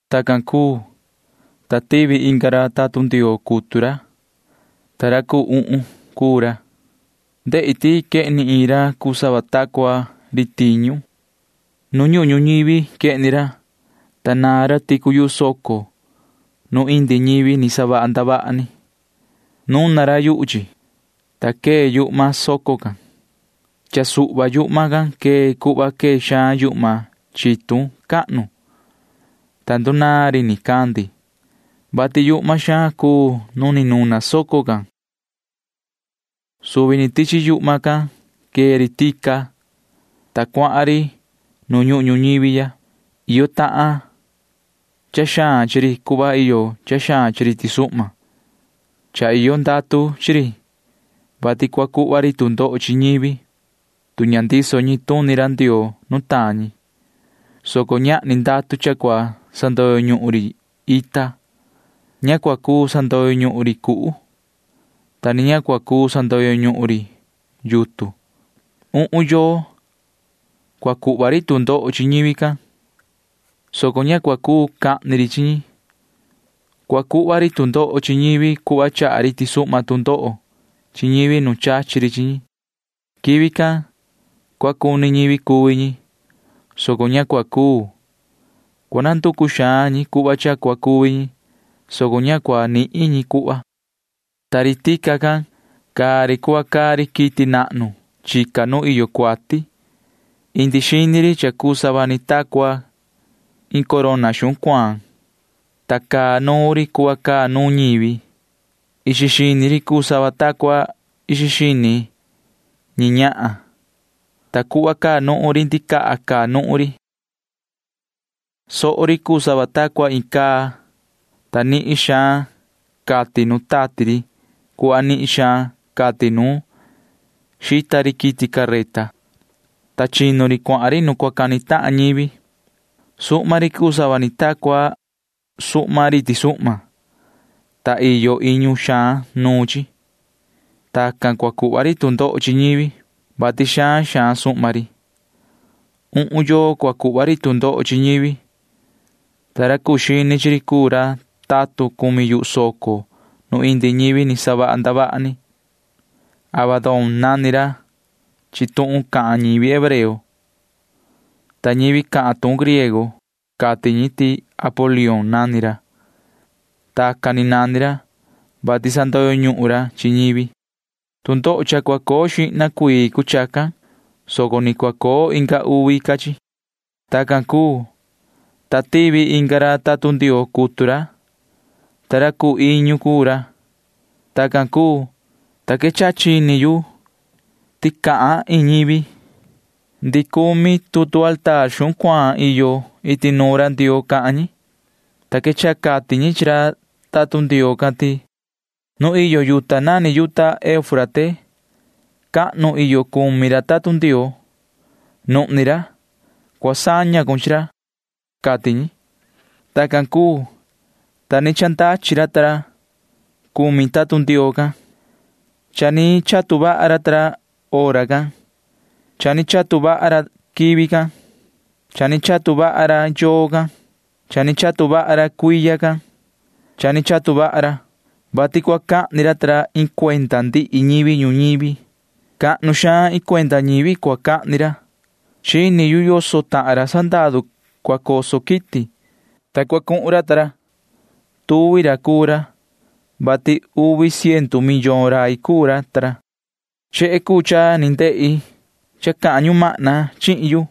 Tacan cuu, ta tivi inga ra tatun Ndioo cutu ra, ta ra cuu uhun cuu ra. Ndehi ti quehni iin ra cuu sava ta cua ri tiñu. Nu ñuhun ñuñivi quehni ra, ta naan ra ticu yuhu soco nu indi ñivi ni savaha ndavaha ni. Nuna ra yuhu chi, ta quee yuhma soco can. Cha suhva yuhma can quee cuhva quee xaan yuhma chitun cahnu, ta ndunaan ri nicandi, vati yuhma xaan cuu nu ni nuna soco can. Suvi ni tichi yuhma can quee ri tica, ta cuahan ri nu ñuhun ñuñivi ya. Iyo tahan cha xaan chi ri cuhva iyo cha xaan chi ri tisuhma. Cha iyo ndatu chi ri, vati cua cuhva ri tu ndoho chi ñivi, tu ña ndiso ñi tuni ra Ndioo nutaan ñi, soco ñahni ndatu cha cua sandoyo ñuhun ri ita. Ña cua cuu sandoyo ñuhun ri cuhu, ta ni ña cua cuu sandoyo ñuhun ri yutun. Uhun yoo cua cuu cuhva ri tu ndoho chi ñivi can, soco ña cua cuu cahni ri chi ñi. Cua cuhva ri tu ndoho chi ñivi cuhva chaha ri tisuhma tu ndoho chi ñivi nu chachi ri chi ñi. Quivi can cua cuni ñivi cuvi ñi, soco ña cua cuu. Cua nanducu xaan ñi cuhva cha cua cuvi ñi, soco ña cua nihin ñi cuhva. Ta ri tica can―caa ri cuhva caa ri quiti nahnu chica nu iyo cuati. Indi xini ri cha cuu sava ni ta cua corona xuhun cuaan, ta caa nuun ri cuhva caa nuun ñivi. Ixi xini ri cuu sava ta cua ixi xini ñi ñahan, ta cuhva caa nuhun ri ndicaha caa nuhun ri. Soo ri cuu sava ta cua iin caa, ta nihin xaan catin nu tati ri cuhva nihin xaan catin nu xita ri quiti careta, ta chinu ri cuahan ri nu cua cani tahan ñivi. Suhma ri cuu sava ni ta cua suhma ri tisuhma, ta iyo iñu xaan nuun chi. Tacan cua cuhva ri tu ndoho chi ñivi, vati xaan xaan suhma ri. Uhun yoo cua cuhva ri tu ndoho chi ñivi, ta ra cuu xini chi ri cuu ra tatun cumi yuhu soco nu indi ñivi ni savaha ndavaha ni. Abadón nani ra chi tuhun cahan ñivi hebreo, ta ñivi cahan tuhun griego―cati ñi ti Apolión nani ra. Tacan ni nani ra, vati sandoyo ñuhun ra chi ñivi. Tu ndoho cha cua coo xihna cuii cuu chacan, soco ni cua coo inga uvi ca chi. Tacan cuu, ta tivi inga ra tatun Ndioo cutu ra, ta ra cuu iñu cuu ra. Tacan cuu, ta quechaha chini yu ti cahan iin ñivi. Ndihi cumi tutu mesa xuhun cuaan iyo iti nuun ra Ndioo cahan ñi, ta quechaha cati ñi chi ra tatun Ndioo can ti: ―Nu iyo yuta nani yuta Eufrate cahnu iyo cumi ra tatun Ndioo―nuhni ra. Cua saña cun chi ra ―cati ñi. Tacan cuu, ta ni chandachi ra cumi tatun Ndioo can. Cha ni chatu vaha ra ta ra hora can. Cha ni chatu vaha ra quivi can. Cha ni chatu vaha ra yoo can. Cha ni chatu vaha ra cuiya can. Cha ni chatu vaha ra, vati cua cahni ra ta ra iin cuenda ndihi ñivi ñuñivi. Cahnu xaan iin cuenda ñivi cua cahni ra. Chini yu yoso tahan ra sandaru cua coso quiti, ta cua cuhun ra. Tuvi ra cuu ra, vati uvi ciendu millón rai cuu ra. Chehe cuu cha ni ndehi cha cahan ñumahna chihin yu.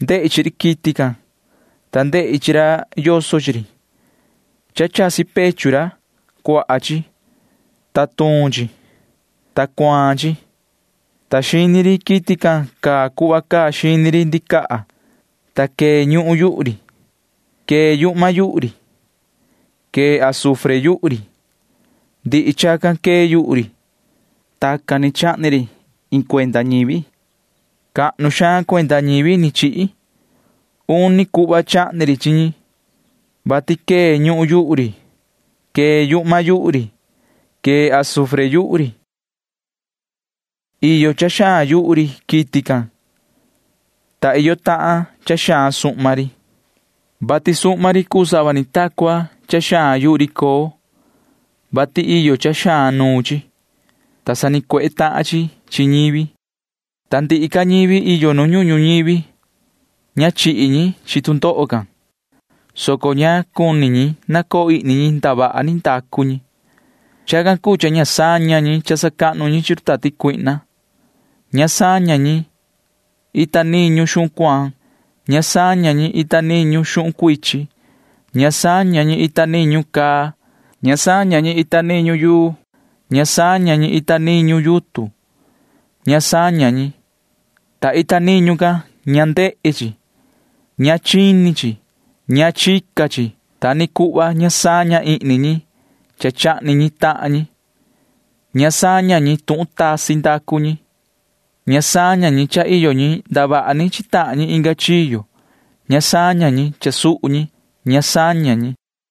Ndehi chi ri quiti can, ta ndehi chi ra yoso chi ri. Cha chasi pechu ra―cuaha chi, ta tuun chi, ta cuaan chi, ta xini ri quiti can caa cuhva caa xini ri ndicaha, ta quee ñuhun yuhu ri. Quee yuhma yuhu ri. Quee azufre yuhu ri. Ndihi chacan quee yuhu ri. Tacan ni chahni ri chi iin cuenda ñivi. Cahnu xaan cuenda ñivi ni chihi. Uni cuhva chahni ri chi ñi, vati quee ñuhun yuhu ri. Quee yuhma yuhu ri, ta quee azufre yuhu ri. Iyo cha xaan yuhu ri quiti can, ta iyo tahan cha xaan suhma ri, vati suhma ri cuu sava ni ta cua cha xaan yuhu ri coo, vati iyo cha xaan nuun chi, ta sanicuehe tahan chi chi ñivi. Ta ndihi ca ñivi iyo nu ñuhun ñuñivi―ña chihi ñi chi tu ndoho can, soco ña cuni ñi nacoo ihni ñi ndavaha ni ndacu ñi. Chacan cuu cha ña saña ñi cha sacahnu ñi chi run tati cuihna. Ña saña ñi ita niñu xuhun cuaan. Ña saña ñi ita niñu xuhun cuichin. Ña saña ñi ita niñu caa. Ña saña ñi ita niñu yuu. Ña saña ñi ita niñu yutun. Ña saña ñi, ta ita niñu can ña ndehe chi. Ña chini chi. Ña chica chi. Ta ni cuhva ña saña ihni ñi cha chahni ñi tahan ñi. Ña saña ñi tuhun tasi ndacu ñi. Ña saña ñi cha iyo ñi ndavaha ni chi tahan ñi inga chiyo. Ña saña ñi cha suhu ñi. Ña saña ñi.